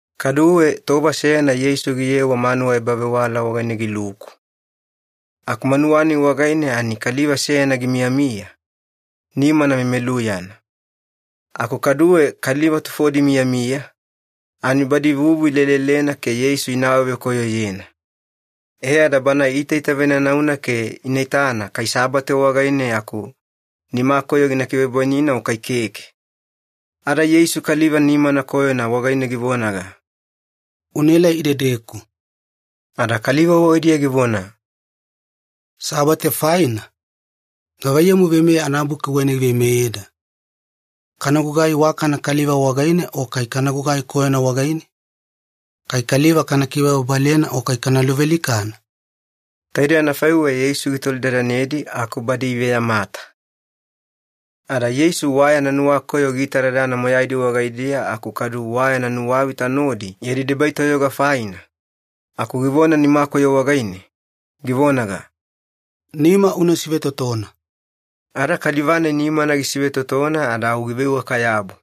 Kaduwe tova seyana Yeisu giyewa manuwa ebavewala wagaine giluku. Aku manuwa-nai wagaine ani kaliva seyana gimiyamiya, nimana memeluyana. Aku kaduwe kaliva tufodi imiyamiya, ani badi vuvu ilelelena ke Yeisu ina awavekoyoyena. E ada Bana iitaitavenanauna ke ina itana kai Sabate wagaine aku nimakoyo gina kivebwainina o kai keke. Ada Yeisu kaliva nimana koyona wagaine givonaga, “Unaelai idedeku.” Ada kaliva wagaidiya givona, “Sabate faina, gavaiyamu Veimeya anabuki wagaine giveimeyeda? Kana gugai iwakana kaliva wagaine o kai kana gugai koyona wagaine? Kai kaliva kana kibababalena o kai kana luvealikana?” Taidei anafaiweya Yeisu gitolidadanedi aku badi iveyamata. Ada Yeisu wa yana nuwakoyo giitadadana moyaidi wagaidiya aku kadu wa yana nuwavita nodi yadi debai toyoga faina, aku givona nimakoyo wagaine, givonaga, “Nima una sivetotona.” Ada kaliva-nai nimana gisivetotona ada au giveiwaka-yabu.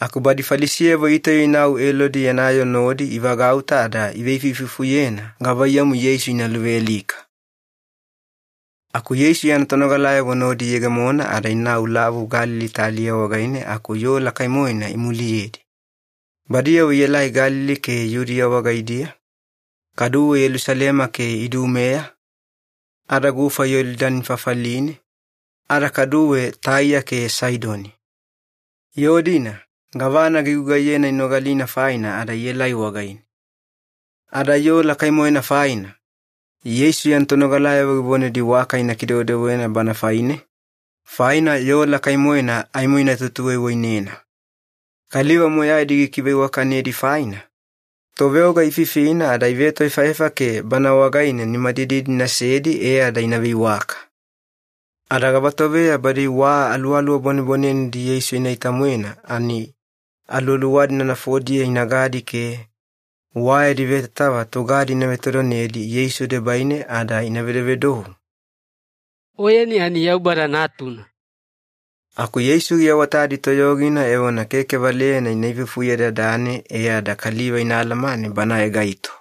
Aku badi Falisiyavo itauya inau Elodi yana yoo nodi ivagauta ada iveifuifufuyena gavaiyamu Yeisu ina luvealika. Aku Yeisu yana tonogalayavo nodi iyegemona ada inau Lavu Galili taliya wagaine aku yoo lakai-moena imuliyedi. Badiyavo ielai Galili ke Yudiya wagaidiya, kaduwe Yelusalema ke Idumea, ada gufa Yolidani fafaline, ada kaduwe Taiya ke Saidoni. Yoo-dina gavana gigugaiyena inogalina faina ada ielai wagaine. Ada yoo lakai-moena faina, Yeisu yana tonogalayavo givonedi waka ina kidewedewena Bana faine, faina yoo lakai-moena aimo ina tutuwaiwainena. Kaliva moyaidi gikiveiwakanedi faina, toveoga ififina ada ivetoefaefa ke Bana wagaine nimadididi inasedi e ada ina veiwaka. Ada gavatoveya badi wa aluwaluwa bwanebwanenedi Yeisu inaita-moena ani aluwaluwa-dina nafodiya inagadi ke, wa yadi vetatava tugadi ina vetovetodonedi Yeisu debaine ada ina vedovedou, “Oyeni ani Yaubada Natuna!” Aku Yeisu giawatadi toyogina evona keke valeyana ina ifufuyedadane e ada kaliva ina alamane Banae gaito.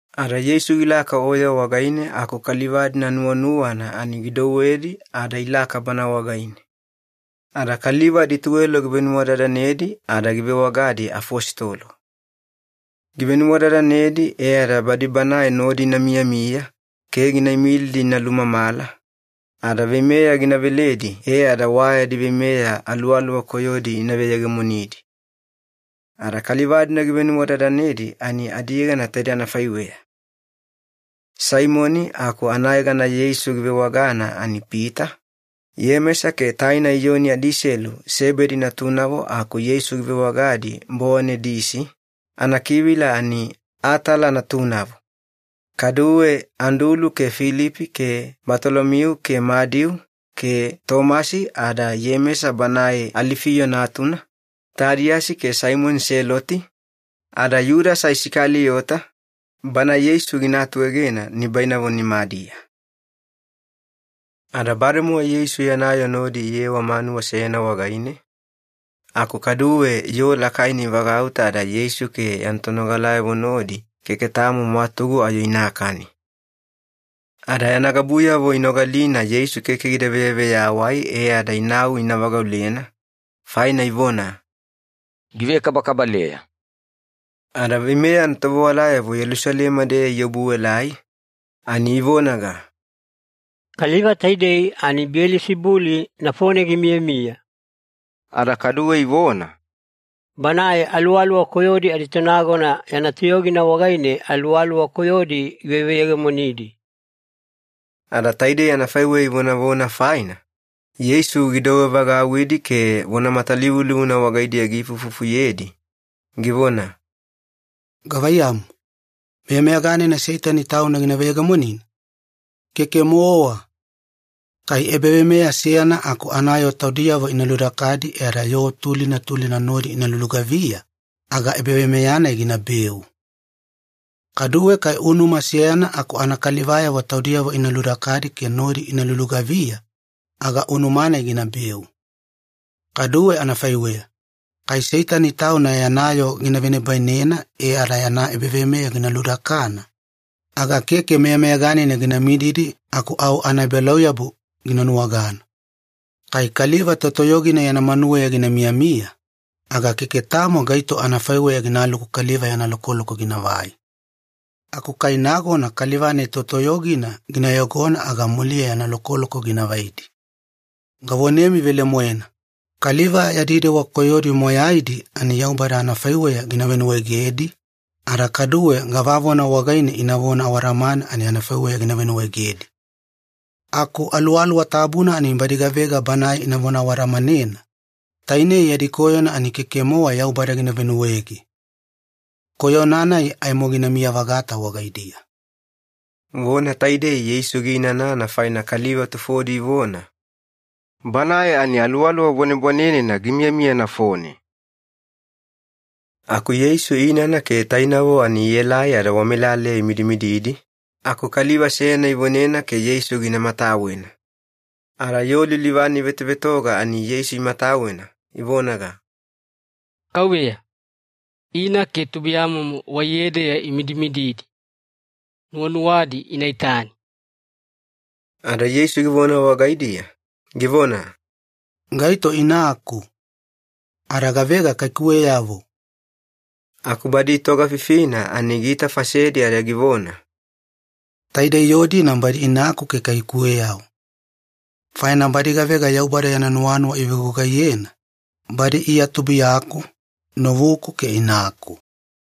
Ada Yeisu gilaka oya wagaine aku kaliva-dina nuwanuwana ani gidouwedi ada ilaka Bana wagaine. Ada kaliva adituwelo givenuwadadanedi ada givewagadi ‘afositolo’. Givenuwadadanedi e ada badi Banae nodi ina miyamiya ke gina imilidi ina lumamala, ada veimeya gina veledi e ada wa yadi veimeya aluwaluwa koyodi ina veyegemonidi. Ada kaliva-dina givenuwadadanedi ani adiyegana taidei anafaiweya. Saimoni aku anayegana Yeisu givewagana ani Pita, Iyemesa ke taina Iyoni adiselu Sebedi natunavo aku Yeisu givewagadi ‘Bowanedisi’, anakivila ani ‘Atala Natunavo’, kaduwe Andulu ke Filipi ke Batolomiu ke Madiu ke Tomasi ada Iyemesa banae Alifiyo natuna, Tadiyasi ke Saimoni Seloti, ada Yudasa Isakaliyota, bana Yeisu gina atuegena nibainavo nimadiya. Ada bademowa Yeisu yana yoo nodi iyewa manuwa seyana wagaine, aku kaduwe yoo lakaina ivagauta ada Yeisu ke yana tonogalayavo nodi keke tamo mwatugu ayo inakani. Ada yana gabuyavo inogalina Yeisu keke gida veyaveyawai e ada inau ina vagaulena, faina ivona, “Givekabakabaleya.” Ada veimeya anatovewalayavo Yelusalema-deya iobuelai, ani ivonaga, “Kaliva taidei ani Biyelisibuli nafone gimiyamiya.” Ada kaduwe ivona, “Banae aluwaluwa koyodi aditonagona yana toyogina wagaine aluwaluwa koyodi giveveyegemonidi.” Ada taidei anafaiweya ivonavona faina, Yeisu gidouwe vagauwidi ke vona matalivulivuna wagaidiya giifuifufuyedi, givona, “Gavaiyamu, meyameyaganina Seitani tauna gina veyegemonina? Keke-mowa. Kai ebaveimeya seyana aku anayoo taudiyavo ina ludakadi e ada yoo tulina tulina nodi ina lulugaviya, aga ebaveimeya-nai ginabeu. Kaduwe kai unuma seyana aku anakalivayavo taudiyavo ina ludakadi ke nodi ina lulugaviya, aga unuma-nai ginabeu. Kaduwe anafaiweya, kai Seitani tauna yana yoo gina venibainena e ada yana ebaveimeya gina ludakana, aga keke meyameyaganina gina mididi aku au anaebalauyabu gina nuwagana. Kai kaliva totoyogina yana manuweya gina miyamiya, aga keke tamo gaito anafaiweya ginaluku kaliva yana lokoloko ginavai. Aku kai nagona kaliva-nai totoyogina gina yogona aga muliya yana lokoloko gina vaidi. Gavonemi velemoena, kaliva yadi dewa koyodi moyaidi ani Yaubada anafaiweya gina venuwaegedi, ada kaduwe gavavona wagaine inavona awadamana ani anafaiweya gina venuwaegedi. Aku Aluwaluwa Tabuna ani badi gavega Banae inavona awadamanena, tainei yadi koyona ani keke-mowa Yaubada gina venuwaege. Koyona-nai aimo ginamiya-vagata wagaidiya.” Vona taidei Yeisu giinanana faina kaliva tufodi ivona, “Banae ani aluwaluwa bwanebwanenena gimiyamiya nafone.” Aku Yeisu inana ke tainavo ani ielai ada wamelaleya imidimididi, aku kaliva seyana ivonena ke Yeisu gina matawena. Ada yoo lilivane ivetovetoga ani Yeisu imatawena, ivonaga, “Kauveya, ina ke tubuiyamomo waiyedeya imidimididi. Nuwanuwadi ina itani.” Ada Yeisu givona wagaidiya, givona, “Gaito inaku? Ada gavega kaikuweyavo?” Aku badi itogafifina ani giitafasedi ada givona, “Taidei yoo-dina badi inaku ke kaikuweyavo. Faina badi gavega Yaubada yana nuwanuwa ivevegugaiyena, badi Iya tubuiyaku, novuku ke inaku.”